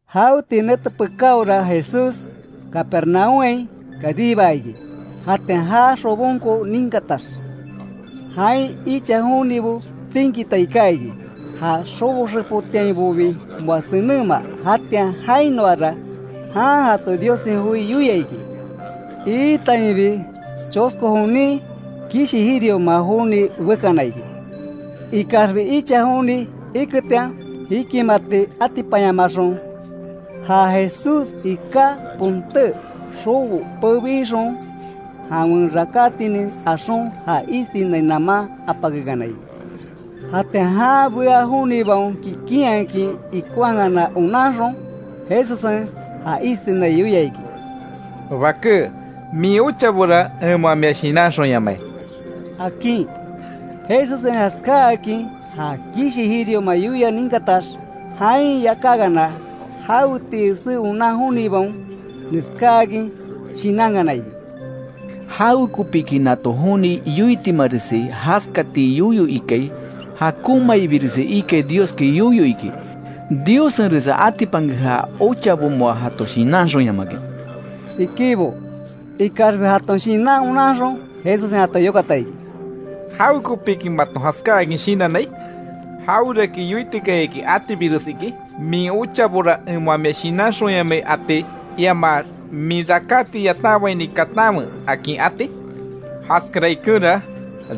Jaweti nete pekáora, Jesús Capernaúmhain karibaa iki. Jatian ja xobonko ninkatax, jain icha jonibo tsinkita iká iki, ja xobo xepotiainbobi moa senenma. Jatian jainoara, jan jato Diossen joi yoia iki. Iitainbi, chosko jonin kishi jirioma joni bekana iki. Ikaxbi icha joni iketian, jikimati atipanyamaxon, ja Jesús iká ponté xobo pebixon, jawen rakátinin axon, ja isinai naman apakekana iki. Jatian jan bea jonibaon kikinhakin, ikonhakana onanxon, Jesussen ja isinai yoia iki: —Baké, min ochabora en moa mia shinanxonyamai —akin. Jesussen jaskáakin ja kishi jirioma yoia ninkatax, jain yakákana jawetii esé onan jonibaon, neskáakin shinankana iki: —¿Jawekopiki nato joni yoitimaresi jaskati yoyo ikai? Jakonmaibiresi ikai, Dioski yoyo iki. Diossenresa atipanke ja ochabo moa jato shinanxonyamakin —ikibo. Ikaxbi jaton shinan onanxon, Jesussen jato yokata iki: —¿Jawekopiki maton jaskáakin shinannai? ¿Jaweraki yoitikayaki atibires iki? ¿Min ochabora en moa mia shinanxonyamai ati? Iamax ¿Min rakáti yatanbaini katanwe akin ati? Jaskara ikenra,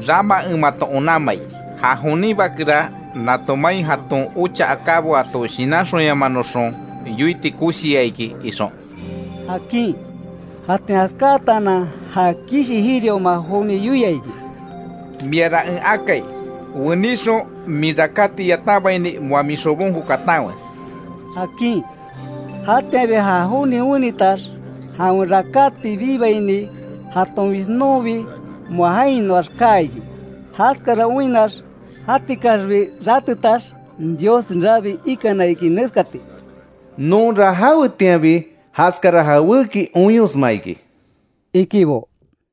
rama en mato onanmai; ja jonin Bakera nato main, jaton ocha akábo jato shinanxonyamanoxon yoiti koshiya iki ixon —akin. Jatian jaskátaanan, ja kishi jirioma joni yoia iki: —Miara en akai: Weníxon, min rakáti yatanbaini moa min xobonko katanwe —akin. Jatianbi ja joni wenitax, jawen rakáti bibaini, jaton jishnonbi moa jainoax kaa iki. Jaskara oinnax, jatikaxbi ratetax, Dios rabii ikana iki, neskati: —Nonra jawetianbi jaskara jawéki oinyosma iki —ikibo.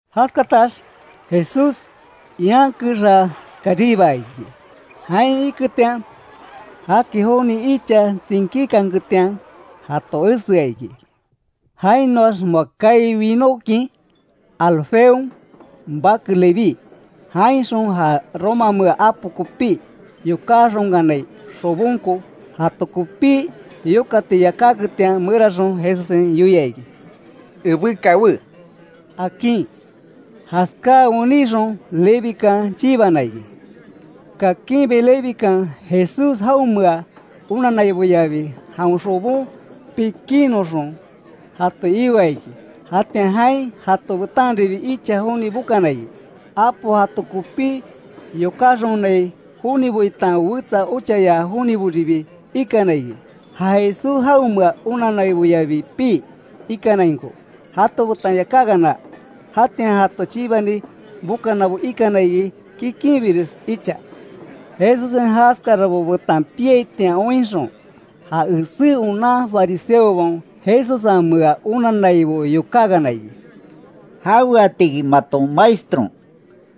Jaskatax Jesús ian kexa karibaa iki. Jain iketian, jaki joni icha tsinkíkanketian jato esea iki. Jainoax moa kaai winókin, Alfeon bake Leví, jainxon ja romamea apo kopí yokáxonkanai xobonko, jato kopí yokati yakáketian meraxon, Jesussen yoia iki: —Ebé kawé —akin. Jaskáa wenixon Levikan chibana iki. Kakinbi Levikan, Jesús jaonmea onanaiboyabi jawen xobon pikinnoxon jato ioa iki. Jatian jain jato betanribi icha joni bokana iki; apo jato kopí yokáxonai jonibo itan wetsa ochaya joniboribi ikana iki, ja Jesús jaonmea onanaiboyabi pii ikanainko jato betan yakákana. Jatian jato chibani bokanabo ikana iki kikinbires icha. Jesussen jaskarabo betan piaitian oinxon, ja esé onan fariseobaon Jesussenmea onannaibo yokákana iki: —¿Jaweatiki maton Maestron,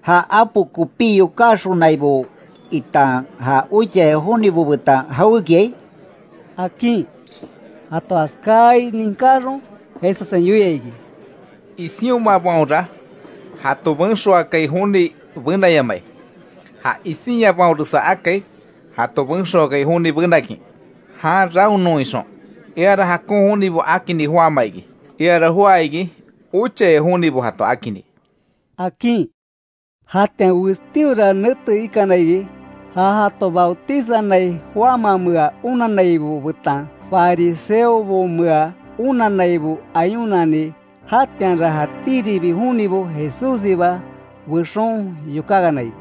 ja apo kopí yokáxonaibo itan ja ochaya jonibo betan jawékiai? —akin. Jato jaskáai ninkáxon Jesussen yoia iki: —Isionmabaonra jato benxoakai joni benayamai. Ja isinyabaonresa akai, jato benxoakai joni benakin jan raonnon ixon. Eara jakon jonibo akinni joáma iki, eara joá iki ochaya jonibo jato akinni —akin. Jatian westíora nete ikana iki, ja jato bautizanai Juanmamea onannaibo betan fariseobomea onannaibo ayunani. Jatianra jatíribi jonibo Jesússiba bexon yokákana iki: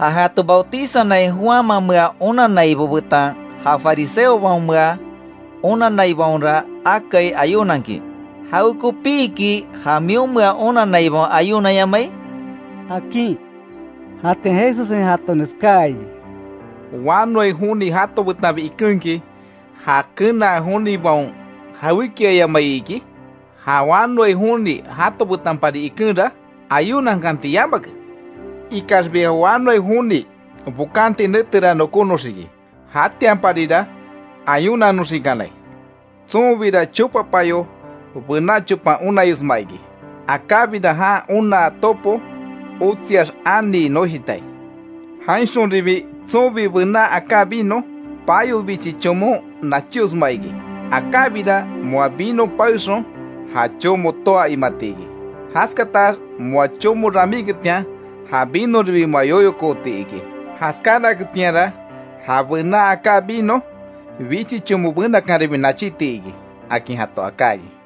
—Ja jato Bautizanai Juanmamea onannaibo betan ja fariseobaomea onanaibaonra akai ayunankin, ¿Jawekopiki ja mionmea onanaibaon ayunanyamai? —akin. Jatian Jesussen jato neskáa iki: —Wanoai joni jato betanbi ikenki ¿Ja kenaa jonibaon jawékiayamai iki? Ja wanoai joni jato betanbipari ikenra, ayunankanti yamake. Ikaxbi ja wanoai joni bokanti netera nokónoxiki, jatianparira ayunanoxikanai. Tsonbira chopa payo bená chopan onayosma iki. Akábira jan onaa topo otsiax anii noshitai. Jainxonribi tsonbi bená aká vino, payo bichi chomon nachíosma iki. Akábira moa vino paexon ja chomo toá imati iki. Jaskatax moa chomo ramíketian ja vinoribi moa yoyokooti iki. Jaskánaketianra ja bená aká vino, bichi chomo benakanribi nachíti iki —akin jato aká iki.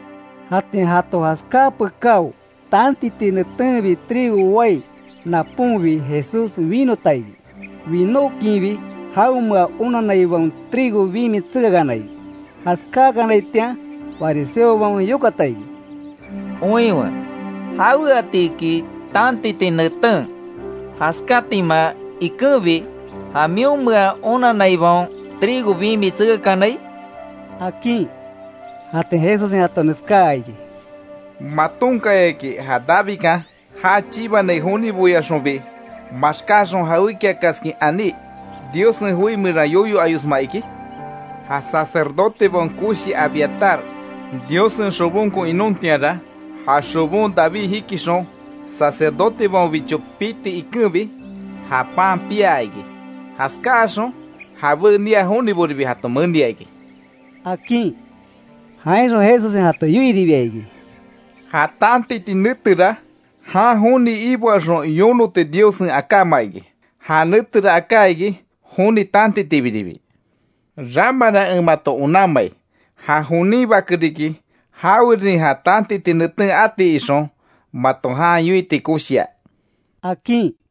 Jatian jato jaskáa pekáo, tantiti netenbi trigo wai naponbi Jesús winota iki, winókinbi jaonmea onanaibaon trigo bimi tsekakana iki. Jaskáakanaitian fariseobaon yokata iki: —Oinwe ¿Jaweatiki tantiti neten jaskátima ikenbi, ja mionmea onanaibaon trigo bimi tsekakanai? —akin. Jatian Jesussen jato neskáa iki: —¿Matonkayaki ja Davidkan, já chibanai joniboyaxonbi, maxkáxon, jawékiakaskin aní, Diossen joi meran yoyo ayosma iki? Ja sacerdotebaon koshi Abiatar, Diossen xobonko inontianra, ja xobon David jikixon, sacerdotebaonbicho piti ikenbi, ja pan piaa iki. Jaskáxon jabé nia joniboribi jato menia iki —akin. Jainxon Jesussen jato yoiribia iki: —Ja tantiti netera, jan joni iboaxon yonoti Diossen akáma iki, ja netera aká iki, joni tantitibiribi. Ramara, en mato onanmai; ja jonin Bake riki, jawerin ja tantiti neten ati ixon mato jan yoiti koshia —akin.